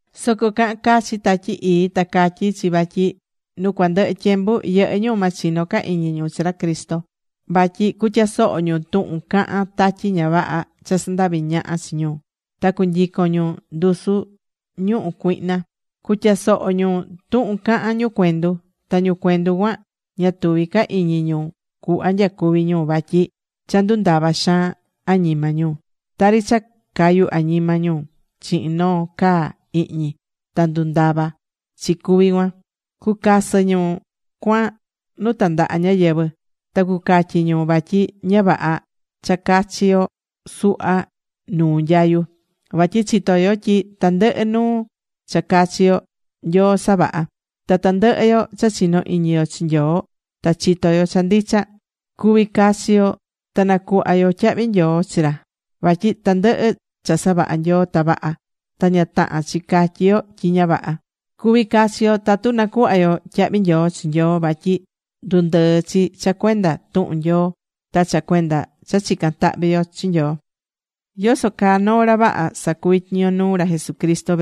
Soco cahán cachi Tatyi Ii ta catyí chi vatyi nu cuandɨhɨ tyembu yɨhɨ́ ñu ma chino ca iñi ñu chi ra Cristo vatyi cutyasoho ñu tuhun cahán tatyi ña vaha cha sandavi ñaha chi ñu. Ta cunyicon ñu ndusu ñuhu cuihna. Cutyasoho ñu tuhun cahán ñu cuendu. Ta ñu cuendu cuan ña tuví ca iñi ñu cuhva nyacuví ñu vatyi cha ndundava̱ xaan añima ñu. Tari cha cayu̱ añima ñu chihin noo caa ihñi ta ndundava̱ chi cuví cuan. Cucasɨ ñu cuan nu tandaha ñáyɨvɨ. Ta cucatyi ñu vatyi ña vaha cha cachi yo suhva nuu nyayu. Vasɨ chitó yo tyi tandɨhɨ nuu cha cachi yo, Nyoo savaha̱. Ta tandɨhɨ yo cha chinó iñi yo chi Nyoo ta chitó yo cha ndicha, cuvi cachi yo ta nacuhva yo tyahvi nyoo chi ra. Vatyi tandɨhɨ cha savaha̱ Nyoo ta vaha. Ta ña tahán chi catyi yo tyi ña vaha. Cuví cachi yo tatu nacuhva yo tyahvi nyoo chi Nyoo. Vatyi ndundɨɨ̱ chi cha cuenda tuhun Nyoo ta cha cuenda cha chicán tahvi yo chi Nyoo.Yoso caa noo ra vaha sacuví tyiño nuu ra Jesucristo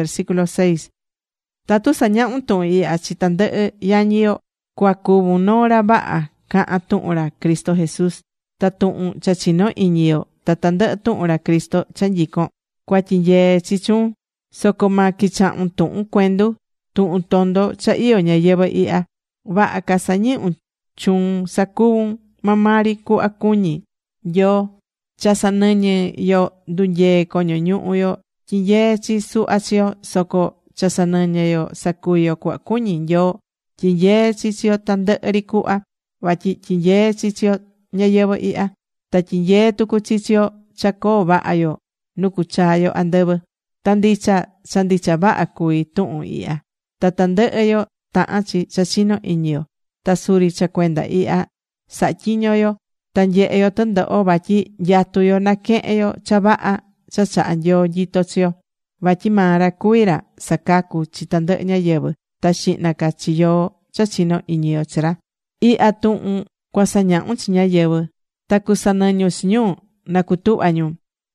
Tatu sañahún tuhun ihya chi tandɨhɨ yañi yo, cua cuvun noo ra vaha cahán tuhun ra Cristo Jesús. Ta tuhun cha chinó iñi yo ta tandɨhɨ tuhun ra Cristo cha nyicón, cua tyinyee chi chuun. Soco ma quichahun tuhun cuendu, tuhun tondo cha iyó ñayɨvɨ̱ ihya. Vaha ca sa̱nɨñun chuun sa̱cuvun maa maa ri cuhva cuñí Nyoo. Cha sanɨñɨ́ yo ndunyee coño ñuhu yo tyinyeé chi suhva chi yo. Soco cha sanɨñɨ́ yo sacuví yo cuhva cuñí Nyoo, tyinyeé chi chi yo tandɨhɨ ri cuhva, vatyi tyinyeé chi chi yo ñayɨvɨ̱ ihya. Ta tyinyeé tucu chi chi yo cha coo vaha yo nu cuchaa yo andɨvɨ. Ta ndicha, cha ndicha vaha cuví tuhun ihya ta tandɨhɨ yo tahán chi cha chinó iñi yo. Ta suri cha cuenda ihya sahá tyiño yo ta nyehé yo tɨndoho vatyi nyatú yo naquehen yo cha vaha cha chaha Nyoo nyito chi yo. Vatyi maa ra cuvi ra sacacú chi tandɨhɨ ñáyɨvɨ, ta xihna ca chi yoó cha chinó iñi yo chi ra. Ihya tuhun cua sa̱ñahun chi ñáyɨvɨ, ta cusanɨñun chi ñu na cutuhva ñu.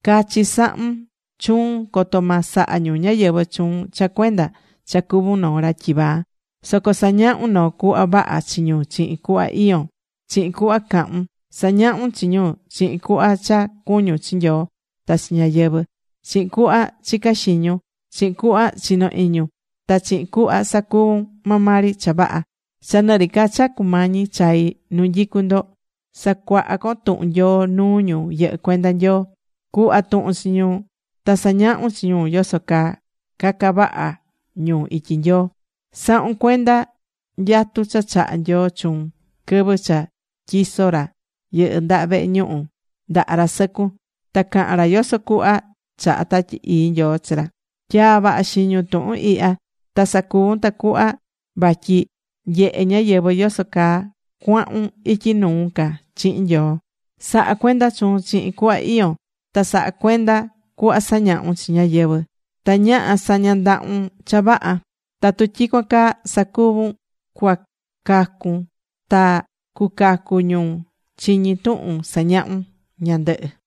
Cachi sa̱hun chuun coto ma saha ñu ñáyɨvɨ chuun cha cuenda cha cuvún noo ra tyivaa. Soco sa̱ñahun noo cuhva vaha chi ñu chihin cuhva iyón, chihin cuhva cahun. Sa̱ñahun chi ñu, chihin cuhva cha cuñún chi Nyoo ta chi ñáyɨvɨ, chihin cuhva chicá xiñun, chihin cuhva chinó iñun, ta chihin cuhva sacuvún maa maa ri cha vaha. Cha nɨ ri ca cha cumañi chai nu nyicú ndo, sa̱cuaha con tuhun Nyoo nuu ñu yɨhɨ́ cuenda Nyoo. Cu̱hva tuhun chi ñu ta sa̱ñahun chi ñu yoso caa caca vaha ñu ityi Nyoo. Sa̱hun cuenda nyatu cha chaha̱ Nyoo chuun quɨvɨ cha tyiso̱ ra yɨndaha vehe ñuhu ndaha ra sɨcun ta caha̱n ra yoso cuhva chahá Tatyi Ii Nyoo chi ra. Tya̱a vaha xiñun tuhun ihya ta sa̱cuvun. Tacuhva vatyi nyehe ñáyɨvɨ yoso caa cuahun ityi nuu ca chihin Nyoo. Sa̱ha cuenda chuun chihin cuhva iyón. Ta sa̱ha cuenda cuhva sañahún chi ñáyɨvɨ ta ñaha sa̱ña ndahun cha vaha. Tatu tyicuan caa sacuvún cuacacun, ta cucacu ñu chiñí tuhun sañahun ñandɨhɨ.